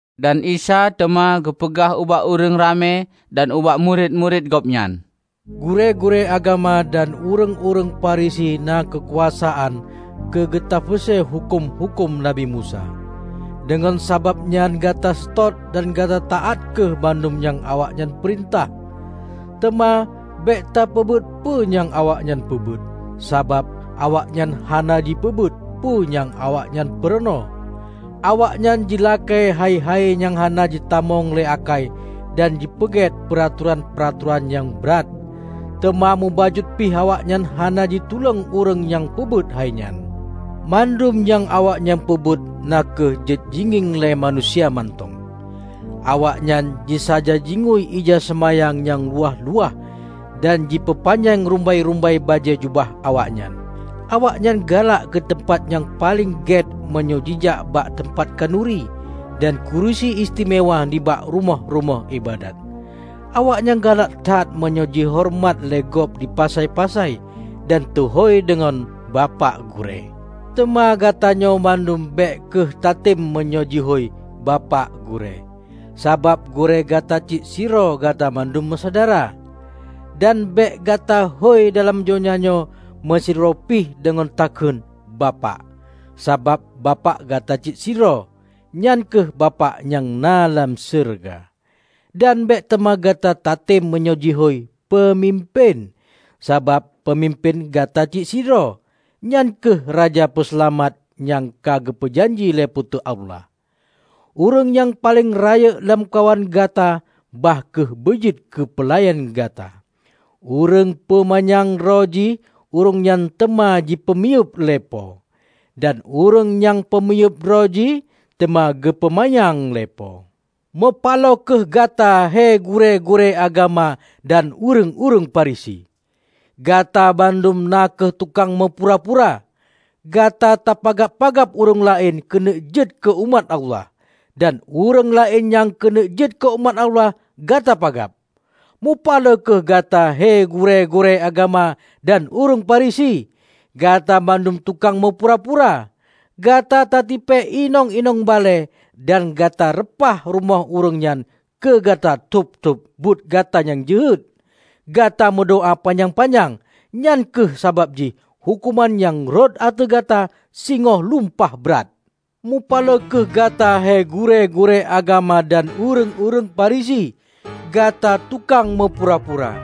Dan Isa teuma geupeugah ubak ureuëng ramé dan ubak murit-murit Gobnyan, "Gurée-gurée agama dan ureuëng-ureuëng Farisi na keukuasaan keu geutafeuse huköm-huköm Nabi Musa. Deungon sabab nyan gata seutôt dan gata taát kheueh bandum nyang awaknyan peurintah. Teuma bék tapeubuet peue nyang awaknyan peubuet, sabab awaknyan hana jipeubuet peue nyang awaknyan peurunoe. Awaknyan jilakée hai-hai nyang hana jitamong lé akai dan jipeuget peuratoran-peuratoran nyang brat, teuma mubacut pih awaknyan hana jitulông ureuëng nyang peubuet hai nyan. Bandum nyang awaknyan peubuet na kheueh jeuet jingieng lé manusia mantong. Awaknyan jisaja jingui ija seumayang nyang luwah-luwah dan jipeupanyang rumbai-rumbai bajée jubah awaknyan! Awaknyan galak keu teumpat nyang paleng gét meunyoe jijak bak teumpat khanuri, dan kurusi istimewa nibak rumoh-rumoh iébadat. Awaknyan galak that meunyoe jihoreumat lé gob di pasai-pasai, dan teuhôi deungon 'Bapak Gurée'. Teuma gata nyoe bandum bék kheueh tatem meunyoe jihôi 'Bapak Gurée', sabab Gurée gata cit sidroe gata bandum meusyedara. Dan bék gata hôi dalam donya nyoe meusidroe pih deungon teukheun 'Bapak', sabab Bapak gata cit sidroe, nyan kheueh Bapak nyang na lam syeuruga. Dan bék teuma gata tatem meunyoe jihôi 'Peumimpén', sabab peumimpén gata cit sidroe, nyan kheueh Raja Peuseulamat nyang ka geupeu janji lé Po teu Allah. Ureuëng nyang paleng rayeuk lamkawan gata, bah kheueh beujeuet keu peulayan gata. Ureuëng peu manyang droe jih ureuëng nyan teuma geupeumiyueb lé Po, dan ureuëng nyang peumiyueb droe jih teuma geupeumanyang lé Po." "Meupaloe kheueh gata he gurée-gurée agama dan ureuëng-ureuëng Farisi! Gata bandum na kheueh tukang meupura-pura. Gata tapagab-pagab ureuëng laén keuneuk jeuet keu umat Allah, dan ureuëng laén nyang keuneuk jeuet keu umat Allah, gata pagab. Meupaloe kheueh gata he gurée-gurée agama dan ureuëng Farisi: Gata bandum tukang meupura-pura. Gata tatipée inong-inong balée dan gata reupah rumoh ureuëng nyan keu gata tôb-tôb buet gata nyang jeuhet, gata meudoá panyang-panyang. Nyan kheueh sabab jih huköman nyang rhot ateueh gata singoh lumpah brat! Mupaloe kheueh gata he gurée-gurée agama dan ureuëng-ureuëng Farisi! Gata tukang meupura-pura!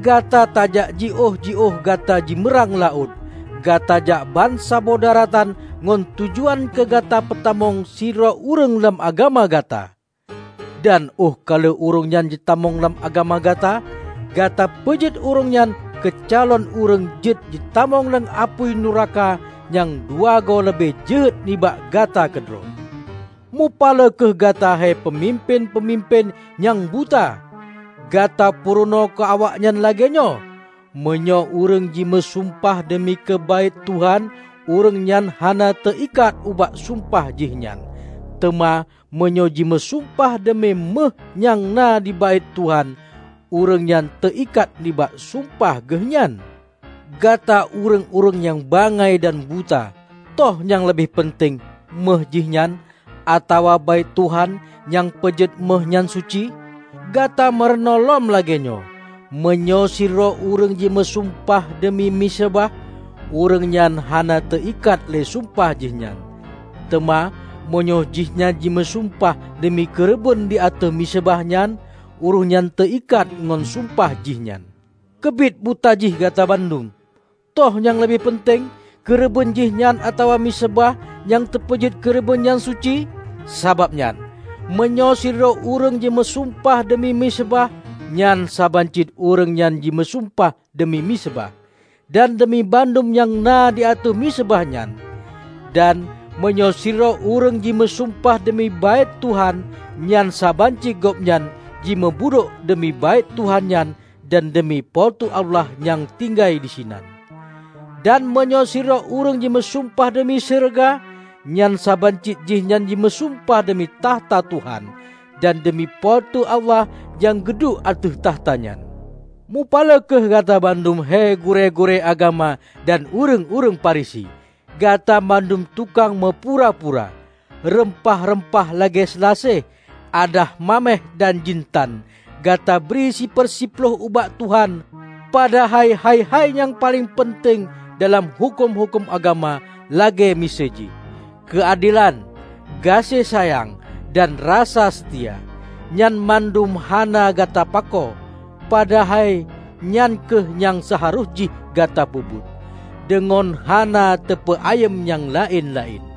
Gata tajak jiôh-jiôh gata jeumeurang laôt, gata jak bansaboh daratan ngon tujuan keu gata peutamong sidroe ureuëng lam agama gata. Dan óh ka lheueh ureuëng nyan jitamong lam agama gata, gata peujeuet ureuëng nyan keu calon ureuëng jeuet jitamong lam apui nuraka nyang dua goe leubeh jeuhet nibak gata keudroe! Mupaloe kheueh gata he peumimpén-peumimpén nyang buta! Gata purunoe keu awaknyan lagée nyoe, 'Meunyoe ureuëng jimeu sumpah deumi keu Baét Tuhan, ureuëng nyan hana teu-ikat ubak sumpah jih nyan; teuma meunyoe jimeusumpah deumi méuh nyang na di Baét Tuhan, ureuëng nyan teu-ikat nibak sumpah geuh nyan.' Gata ureuëng-ureuëng nyang bangai dan buta! Toh nyang leubeh peunteng méuh jihnyan, atawa Baét Tuhan nyang peujeuet méuh nyan suci? Gata meurunoe lom lagée nyoe, 'Meunyoe sidroe ureuëng jimeusumpah deumi miseubah, ureuëng nyan hana teu-ikat lé sumpah jihnyan; teuma meunyoe jihnyan jimeusumpah deumi keureubeuen di ateueh miseubah nyan, ureuëng nyan teu-ikat ngon sumpah jih nyan.' Keubiet buta jih gata bandum! Toh nyang leubeh peunteng? Keureubeuen jihnyan atawa miseubah nyang teupeujeuet keureubeuen nyan suci? Sabab nyan, meunyoe sidroe ureuëng meusumpah deumi miseubah, nyan saban cit ureuëng nyan jimeusumpah deumi miseubah, dan deumi bandum nyang na di ateueh miseubah nyan. Dan meunyoe sidroe ureuëng jimeusumpah deumi Baét Tuhan, nyan saban cit gobnyan jimeubudôk deumi Baét Tuhan nyan dan deumi Po teu Allah nyang tinggai disinan. Dan meunyoe sidroe ureuëng jimeusumpah deumi syeuruga, nyan saban cit jihnyan meusumpah deumi takhta Tuhan, dan deumi Po teu Allah nyang geuduek ateueh takhta nyan. Mupaloe kheueh gata bandum hé gurée-gurée agama dan ureuëng-ureuëng Farisi! Gata bandum tukang meupura-pura. Reumpah-reumpah lagée seulaseh, adas maméh dan jintan, gata bri siper siploh ubak Tuhan. Padahai hai-hai nyang paleng peunteng dalam huköm-huköm agama, lagée miseue jih: keuadelan, gaséh sayang, dan rasa seutia, nyan bandum hana gata pakoe. Padahai nyan kheueh nyang seuharôh jih gata peubuet, deungon hana tapeu-ayeuem nyang laén-laén.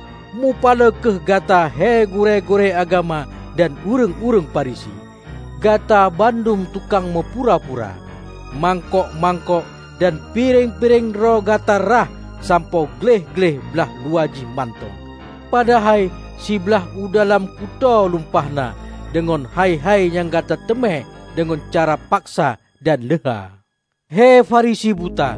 Meupaloe kheueh gata he gurée-gurée agama dan ureuëng-ureuëng Farisi! Gata bandum tukang meupura-pura! Mangkok-mangkok dan pireng-pireng droe gata rhah sampoe gleh-gleh blaih luwa jih mantong, padahai siblaih u dalam kutoe lumpah na deungon hai-hai nyang gata teumé deungon cara paksa dan leuha. He Farisi buta!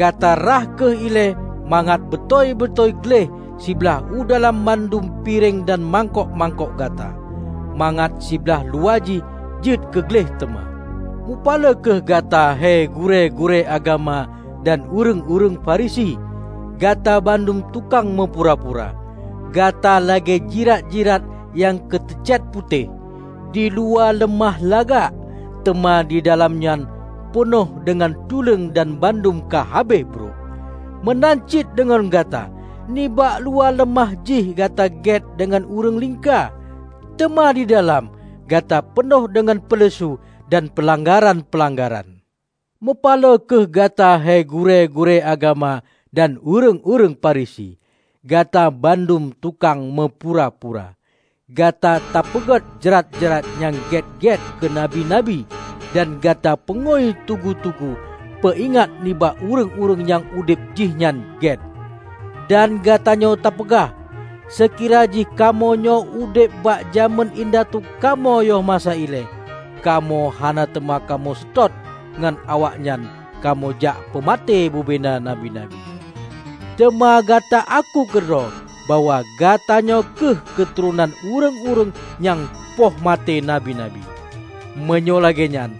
Gata rhah kheueh ilée mangat beutôi-beutôi gleh siblaih u dalam bandum pireng dan mangkok-mangkok gata, mangat siblaih luwa jih jeuet keu gleh teuma! Meupaloe kheueh gata he gurée-gurée agama dan ureuëng-ureuëng Farisi! Gata bandum tukang meupura-pura! Gata lagée jirat-jirat nyang teu cét putéh; diluwa leumah lagak, teuma didalam nyan peunoh deungon tuleueng dan bandum ka habéh brok. Meunan cit deungon gata. Nibak luwa leumah jih gata gét deungon ureuëng lingka; teuma didalam, gata peunoh deungon peuleusu dan peulanggaran-peulanggaran." "Meupaloe kheueh gata he gurée-gurée agama dan ureuëng-ureuëng Farisi! Gata bandum tukang meupura-pura! Gata tapeugôt jrat-jrat nyang gét-gét keu nabi-nabi, dan gata peungui tugu-tugu peuingat nibak ureuëng-ureuëng nyang udeb jihnyan gét. Dan gata nyoe tapeugah, 'Seukira jih kamoe nyoe udeb bak jamén indatu kamoe yoh masa ilée, kamoe hana teuma kamoe seutôt ngon awaknyan kamoe jak peumaté bubena nabi-nabi.' Teuma gata aku keudroe bahwa gata nyoe kheueh keuturonan ureuëng-ureuëng nyang poh maté nabi-nabi! Meunyoe lagée nyan,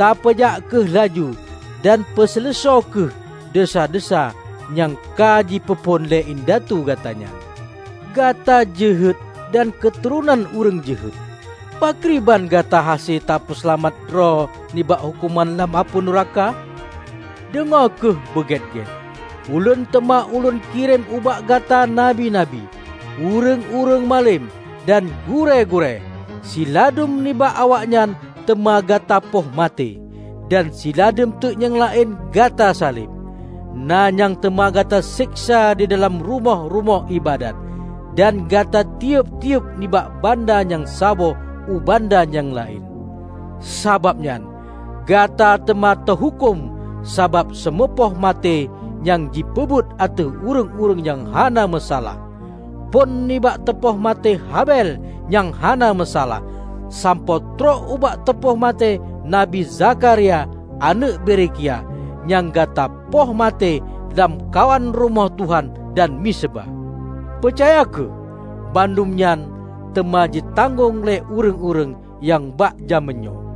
tapeujak kheueh laju dan peuseuleusoe kheueh desya-desya nyang ka jipeuphon lé indatu gata nyan! Gata jeuhet dan keuturonan ureuëng jeuhet! Pakriban gata hase tapeuseulamat droe nibak huköman lam apui nuraka? Deungoe kheueh beu gét-gét: Ulôn teuma Lôn kirém ubak gata nabi-nabi, ureuëng-ureuëng malem, dan gurée-gurée; siladum nibak awaknyan teuma gata poh maté, dan siladum teuk nyang laén gata saleb. Na nyang teuma gata seksa didalam rumoh-rumoh iébadat, dan gata tiyeub-tiyeub nibak banda nyang saboh u banda nyang laén. Sabab nyan, gata teuma teuhuköm sabab seumeupoh maté nyang ji peubuet ateueh ureuëng-ureuëng nyang hana meusalah -- phon nibak teupoh maté Habel nyang hana meusalah, sampoe trok ubak teupoh maté Nabi Zakharia aneuëk Berekia, nyang gata poh maté lamkawan Rumoh Tuhan dan miseubah. Peucaya kheueh: bandum nyan teuma jitanggong lé ureuëng-ureuëng bak jamén nyoe!"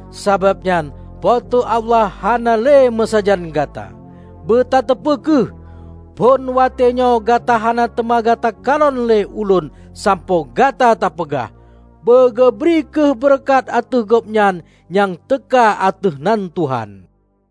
Sabab nyan Po teu Allah hana le meusajan gata. Beutateupeu kheueh: Phon watée nyoe gata hana teuma gata kalon le Ulôn sampoe gata tapeugah, 'Beugeubri kheueh beureukat ateueh Gobnyan nyang teuka ateueh nan Tuhan.' "